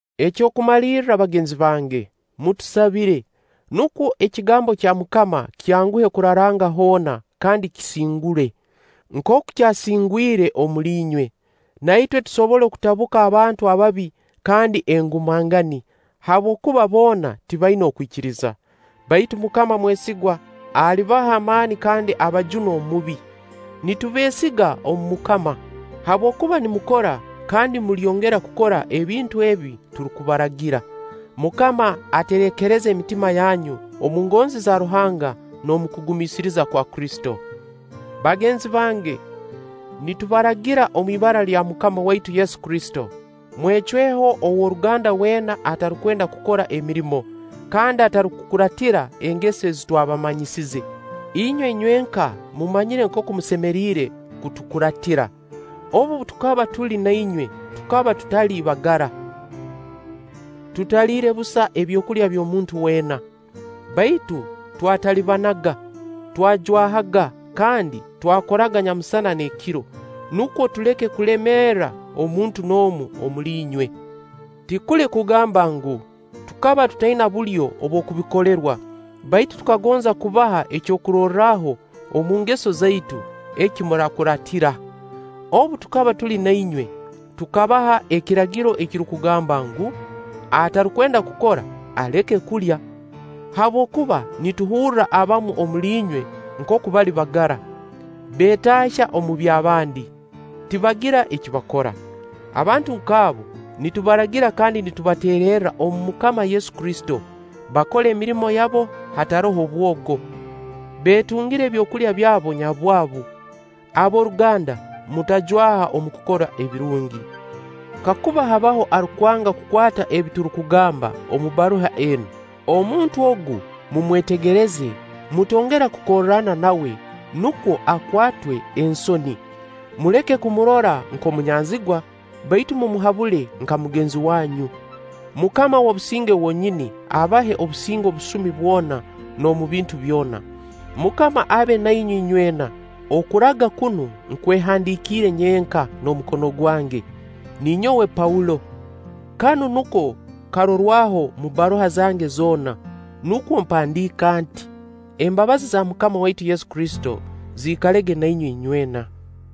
Eky'okumalirra bagenzi bange, mutusabire, nukwo ekigambo kya MUKAMA kyanguhe kuraranga hoona kandi kisingule, nkooku kyasingwire omuli inywe; na itwe tusobole kutabuka abantu ababi kandi engumangani, habwokuba boona tibaina okwikiriza. Baitu MUKAMA mwesigwa; alibaha amaani kandi abajune Omubi. Nitubeesiga omu MUKAMA, habwokuba nimukora kandi mulyongera kukora ebintu ebi turukubaragira. MUKAMA aterekereze emitima yanyu omu ngonzi za Ruhanga n'omu kugumiisiriza kwa Kristo. Bagenzi bange, nitubaragira omu ibara lya MUKAMA waitu Yesu Kristo, mwecweho ow'oruganda weena atarukwenda kukora emirimo kandi atarukukuraatira engeso ezi twabamanyize. Inywe inywenka mumanyire nkooku musemeriire kutukuraatira. Obu tukaba tuli na inywe tukaba tutali bagara, tutaliire busa ebyokulya by'omuntu weena, baitu twatalibanaga, twajwahaga kandi twakoraga nyamusana n'ekiro, nukwo tuleke kulemeera omuntu n'omu omuli inywe. Tikuli kugamba ngu, tukaba tutaina bulyo obw'okubikolerwa, baitu tukagonza kubaha ekyokurorraho omu ngeso zaitu, eki muraakuraatira. Obu tukaba tuli na inywe, tukabaha ekiragiro ekirukugamba ngu: Atarukwenda kukora, aleke kulya. Habwokuba nituhurra abamu omuli inywe nkooku bali bagara, beetaahya omu by'abandi, tibagira eki bakora. Abantu nk'abo nitubaragira kandi nitubateererra omu MUKAMA Yesu Kristo, bakole emirimo yabo hataroho bwogo, beetungire ebyokulya byabo nyabwabu. Ab'oruganda, mutajwaha omu kukora ebirungi. Kakuba habaho arukwanga kukwata ebi turukugamba omu bbaruha enu, omuntu ogu mumwetegereze, mutongera kukorrana nawe, nukwo akwatwe ensoni. Muleke kumurora nk'omunyanzigwa, baitu mumuhabule nka mugenzi wanyu. MUKAMA w'obusinge wonyini, abahe obusinge obusumi bwona n'omu bintu byona. MUKAMA abe nainywe inywena. Okuraga kunu nkwehandiikire nyenka n'omukono gwange: Ninyowe Paulo. Kanu nuko karorwaho omu bbaruha zange zoona; nukwo mpandiika nti. Embabazi za MUKAMA waitu Yesu Kristo ziikalege na inywe inywena.